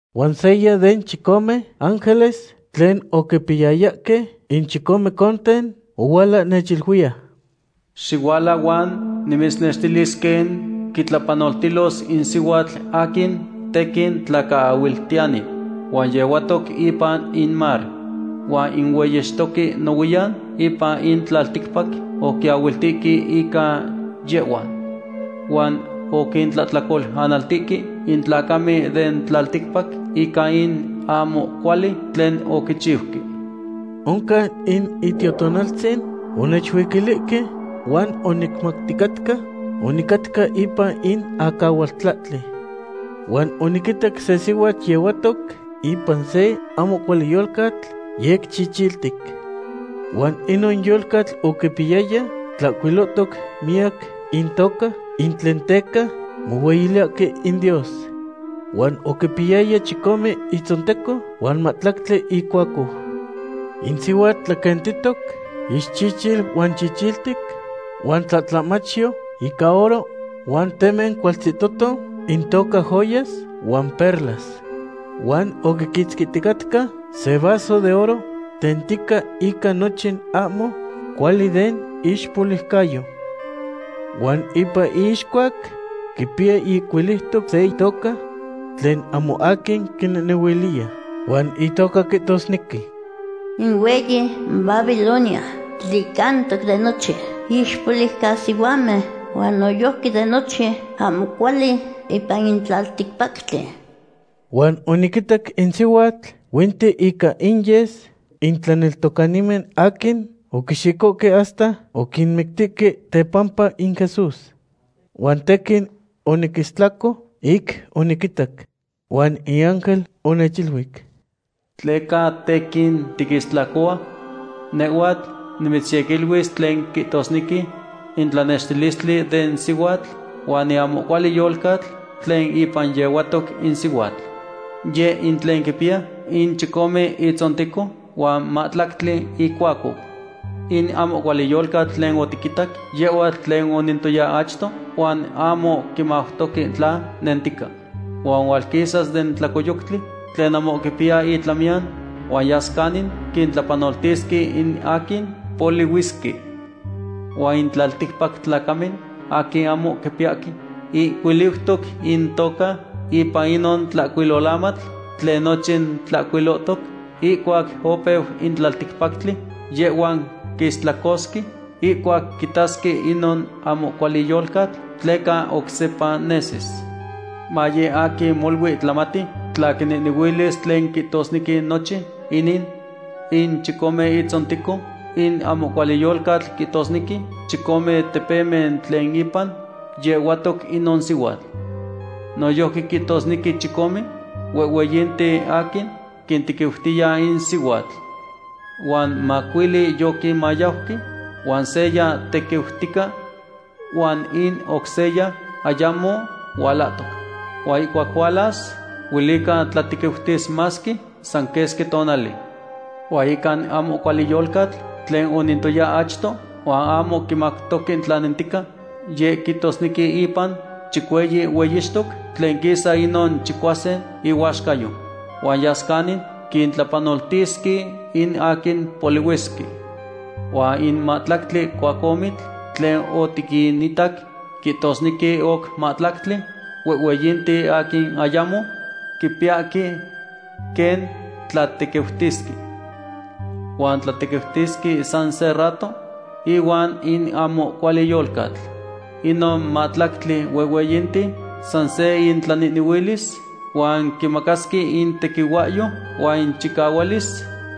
Huan seya den chicome ángeles tlen oquipiyayahque in chicome conten ohuala nechiluiya: ―Xihuala huan nimitznextilis quen quitlapanoltilos in sihuatl aquin tequin tlacaahuiltiyani. Huan yehuatoc ipan in mar. Huan in hueyixtoque nohuiyan ipan in tlalticpac oquiahuiltihque ica yehhua. Huan oquintlahtlacolanaltihque in tlacamen den tlalticpac ica in ahmo cuali tlen oquichiuque. Oncan in Itiotonaltzin onechuiquilihque huan onicmauticatca onicatca ipan in acahualtlahtli. Huan oniquitac se sihuatl yehuatoc ipan se ahmo cuali yolcatl yec chichiltic. Huan inon yolcatl oquipiyaya tlahcuilotoc miyac intoca ic tlen teca mohueyiliyahque in Dios. Huan oquipiyaya chicome itzonteco huan mahtlactli icuacou. In sihuatl tlaquentitoc ixchichil huan chichiltic huan tlatlahmachyo ica oro huan temen cualtzihtoto intoca joyas huan perlas. Huan oquiquitzquihticatca se vaso de oro tentica ica nochin ahmo cuali den iixpoliucayo. Huan ipan iixcuac quipiya ihcuiliutoc se itoca tlen ahmo aquin quinehnehuiliya. Huan itoca quihtosnequi: “In hueyi Babilonia, tlicantoc de nochin ixpoliucasihuamen, huan noyojqui de nochin ahmo cuali ipan in tlalticpactli.” Huan oniquitac in sihuatl huinti ica inyes in tlaneltocanimen aquin oquixicohque hasta oquinmictihque tepampa in Jesús. Huan tequin oniquistlaco ic oniquitac. Huan in ángel onechiluic: ―¿Tleca tequin tiquistlacohua? Nehhuatl nimitzyequiluis tlen quihtosnequi in tlanextilistli den sihuatl huan in ahmo cuali yolcatl tlen ipan yehuatoc in sihuatl. Yeh in tlen quipiya in chicome itzonteco huan mahtlactli icuacou. In ahmo cuali yolcatl tlen otiquitac, yehhua tlen onentoya achto huan ahmo quimautoque tla nentica. Huan hualquisas den tlacoyoctli tlen ahmo quipiya itlamiyan, huan yas canin quintlapanoltisque in aquin polihuisque. Huan in tlalticpac tlacamen aquin ahmo quipiyahque ihcuiliutoc intoca ipan inon tlahcuilolamatl tlen nochin tlahcuilohtoc ihcuac opeu in tlalticpactli, yehhuan quistlacosque ihcuac quitasque inon ahmo cuali yolcatl, tleca oc sepa nesis. ’Maye aquin molui tlamati tla quinehnehuilis tlen quihtosnequi nochin inin. In chicome itzonteco in ahmo cuali yolcatl quihtosnequi chicome tepemen tlen ipan yehuatoc inon sihuatl. Noyojqui quihtosnequi chicome huehhueyinten aquin quintequiutiya in sihuatl. Huan macuili yoquinmayauque, huan seya tequiutica, huan in oc seya ayamo hualahtoc. Huan ihcuac hualas, huelica tlatequiutis masque san quesqui tonali. Huan ica in ahmo cuali yolcatl tlen onentoya achto huan ahmo quimautoque tla nentica, yeh quihtosnequi ipan chicueyi hueyixtoc tlen quisa inon chicuasin ihuaxcayo. Huan yas canin quintlapanoltisque in aquin polihuisque. ’Huan in mahtlactli cuacohmitl tlen otiquinitac quihtosnequi oc mahtlactli huehhueyinten aquin ayamo quipiyahque quen tlatequiutisque. Huan tlatequiutisque san se rato ihuan in ahmo cuali yolcatl. Inon mahtlactli huehhueyinten san se intlanehnehuilis huan quimacasque intequihuahyo huan inchicahualis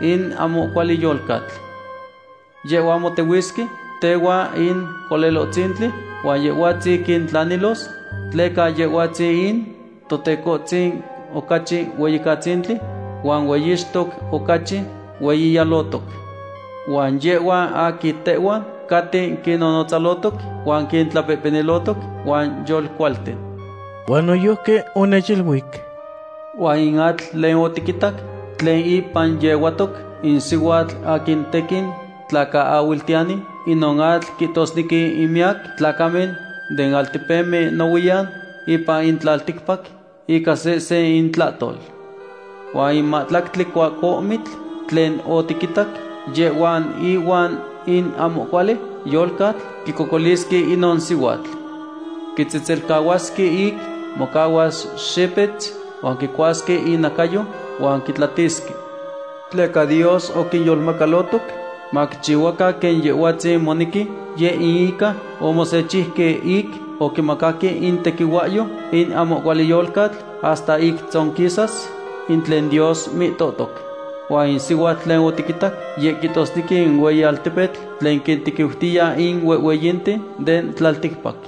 in ahmo cuali yolcatl. Yehhuan motehuisque tehuan in Colelohtzintli, huan Yehhuatzin quintlanilos tleca Yehhuatzin in Tecohtzin ocachi Hueyicatzintli, huan Hueyixtoc ocachi hueyiyalotoc. Huan yehhuan aquin tehuan caten quinnotzalotoc, huan quintlapehpenilotoc, huan yolcualten. Huan noyojqui onechiluic: ―Huan in atl tlen otiquitac tlen ipan yehuatoc in sihuatl aquin tequin tlacaahuiltiyani, inon atl quihtosnequi in miyac tlacamen den altepemen nohuiyan ipan in tlalticpac, ica sehsen intlahtol. Huan in mahtlactli cuacohmitl tlen otiquitac, yehhuan ihuan in ahmo cuali yolcatl quicocolisque inon sihuatl. Quitzetzelcahuasque ic mocahuas xipetz, huan quicuasque inacayo huan quitlatisque. Tleca Dios oquinyolmacalotoc maquichihuacan quen Yehhuatzin monequi, yeh in ica omosechiuque ic oquimacaque in tequihuahyo in ahmo cuali yolcatl hasta ic tzonquisas in tlen Dios mihtohtoc. Huan in sihuatl tlen otiquitac, yeh quihtosnequi in hueyi altepetl tlen quintequiutiya in huehhueyinten den tlalticpac.